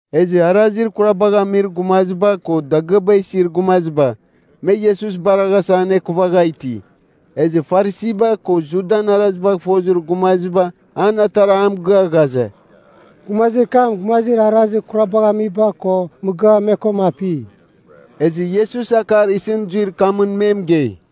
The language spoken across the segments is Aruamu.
Ezɨ arazir kurabagh amir gumaziba ko dagɨaba isir gumaziba, me Iesus baraghasa anekuvagha iti. Ezɨ Farisiba ko Judan arazibagh fofozir gumaziba an atara a mɨgɨa ghaze, “Gumazir kam gumazir arazir kurabagh amiba ko mɨgɨa me koma api.” Ezɨ Iesus akar isɨn zuir kamɨn me mɨgei,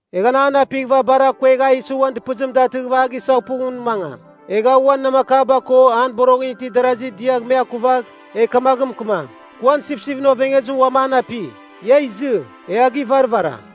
Egh anan apighɨva bar akuegh a isi uan dɨpɨzim datɨgh a gisaghpugh ngun mangam. Egh a uan namakaba ko an boroghɨn itir darazir diagh me akuvagh, egh kamaghɨn mɨkɨmam, ‘Kɨ uan sipsipɨn ovengezim uam an api! Ia izɨ. E a givarvaram.’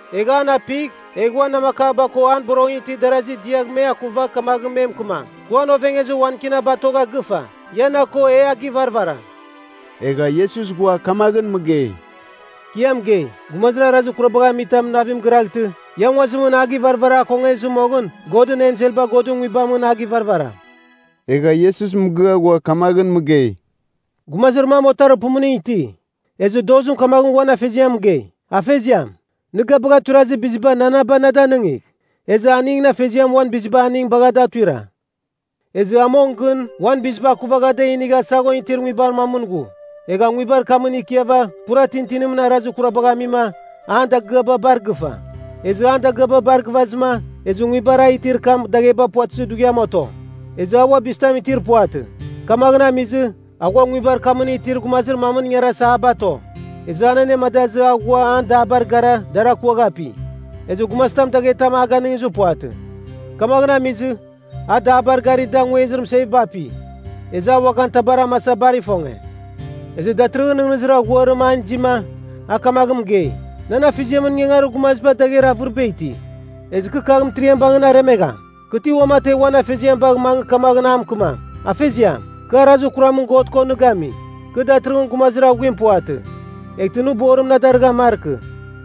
Egh an apigh, egh uan namakaba ko an boroghɨn itir darazir diagh me akuvagh kamaghɨn me mɨkɨmam, ‘Kɨ uan ovengezir wan Kina batogha gɨfa. Ia na ko e a givarvaram.’” Egha Iesus ghua kamaghɨn mɨgei, “Kɨ ia mɨgei, gumazir arazir kurabagh amitam navim giraghtɨ, ia nguazimɨn a givarvara akongezɨ moghɨn Godɨn enselba Godɨn Nguibamɨn a givarvaram.” Egha Iesus mɨgɨa ghua kamaghɨn mɨgei, “Gumazir mam otarir pumuning iti. Ezɨ dozim kamaghɨn uan afeziam mɨgei, ‘Afeziam, nɨ ga bagha tuirazir biziba nananaba na danɨngigh.’ Ezɨ aningɨn afeziam uan biziba aning bagha da tuira. “Ezɨ a mong gɨn uan biziba akuvagha da inigha saghon itir nguibar mamɨn ghu. Egha nguibar kamɨn ikiava pura tintinimɨn arazir kurabagh amima, an dagɨaba bar gɨfa. Ezɨ an dagɨaba bar gɨvazɨma, ezɨ nguibar a itir kam dagheba puvatɨzir dughiam oto. Ezɨ a ua bizitam itir puvatɨ. Kamaghɨn amizɨ, a ghua nguibar kamɨn itir gumazir mamɨn ingarasa a bato. Ezɨ a anemadazɨ a ghua an dabar gara dar akuagh api. Ezɨ gumazitam daghetam a ganɨngizɨ puvatɨ. Kamaghɨn amizɨ, a dabar gari da nguezibar mɨseviba api. Ezɨ a uaghan tabar amasa bar ifonge. “Ezɨ datɨrɨghɨn nɨghnɨzir aghuarim an izima, a kamaghɨn mɨgei, ‘Nan afeziamɨn ingangarir gumaziba dagher avɨriba iti. Ezɨ kɨ kagh mɨtiriam bangɨn aremegham. Kɨ ti uamategh uan afeziam bagh mangɨ kamaghɨn a mɨkɨmam, “Afeziam, kɨ arazir kuramɨn God ko nɨ gami. Kɨ datɨrɨghɨn gumazir aghuim puvatɨ. Eghtɨ nɨ borim na darɨghan markɨ.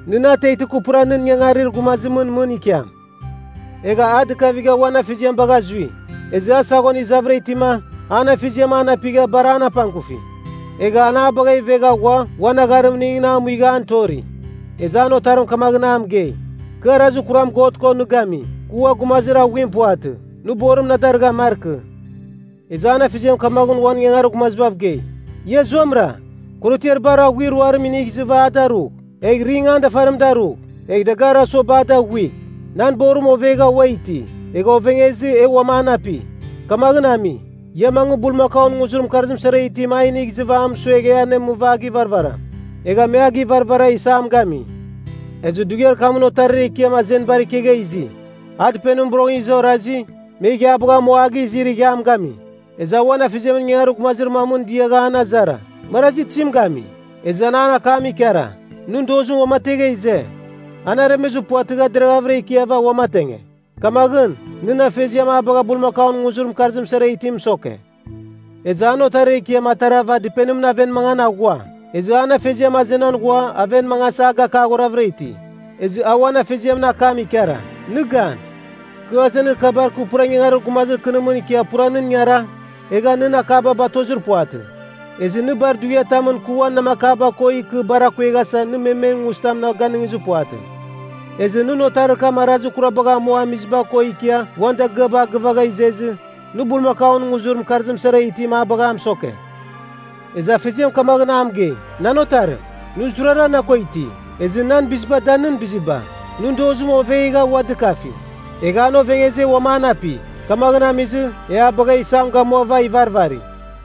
Nɨ na ateghtɨ kɨ pura nɨn ingangarir gumazimɨn mɨn ikiam.” ’ Egha a dɨkavigha uan afeziam bagha zui. “Ezɨ a saghon izavɨra itima, an afeziam an apigha bar an apangkufi. Egha an a bagha ivegha ghua uan agharimningɨn a muigha an tori. “Ezɨ an otarim kamaghɨn a mɨgei, ‘Kɨ arazir kuram God ko nɨ gami. Kɨ ua gumazir aghuim puvatɨ, nɨ borim na darɨghan markɨ.’ Ezɨ an afeziam kamaghɨn uan ingangarir gumazibav gei, ‘Ia zuamɨra! Korotiar bar aghuir ruarim inigh izɨva a darugh. Egh ring an dafarim darugh, egh dagarir asuaba a daghuigh! Nan borim ovegha ua iti. Egha ovengezɨ e uam an api. Kamaghɨn ami, ia mangɨ bulmakaun nguzir mɨkarzim sara itim a inigh izɨva a mɨsuegh e anemɨva a givarvaram.’ Egha me a givarvara isam gami. “Ezɨ dughiar kamɨn otarir ekiam azenibar ikegha izi. A dɨpenimɨn boroghɨn iza orazi, me ighiabagh amua izi ighiam gami. Ezɨ a uan afeziamɨn ingangarir gumazir mamɨn diagha an azara, ‘Marazi tizim gami?’ Ezɨ a an akam ikara, ‘Nɨn dozim uamategha ize. An aremezɨ puvatɨgha deravɨra ikiava uamatenge. Kamaghɨn, nɨn afeziam a bagha bulmakaun nguzir mɨkarzim sara itim mɨsoke.’ “Ezɨ an otarir ekiam atarava dɨpenimɨn aven mangan aghua. Ezɨ an afeziam azenan ghua aven mangasa a gakaghoravɨra iti. Ezɨ a uan afeziamɨn akam ikara, ‘Nɨ gan! Kɨ azenir kabar kɨ pura ingangarir gumazir kɨnimɨn ikia pura nɨn ingara, egha nɨn akaba batozir puvatɨ. Ezɨ nɨ bar dughiatamɨn kɨ uan namakaba ko ikɨ bar akueghasa nɨ memen nguzitam na ganɨngizɨ puvatɨ. Ezɨ nɨn otarir kam arazir kurabagh amua amiziba ko ikia uan dagɨaba a gɨvagha izezɨ, nɨ bulmakaun nguzir mɨkarzim sara itim a bagha a mɨsoke!’ Ezɨ afeziam kamaghɨn a mɨgei, ‘Nan otarim, nɨ zurara na ko iti. Ezɨ nan biziba da nɨn biziba. Nɨn dozim ovegha ua dɨkafi. Egha an ovengezɨ e uam an api. Kamaghɨn amizɨ, e a bagh isam gamuava ivarvari.’”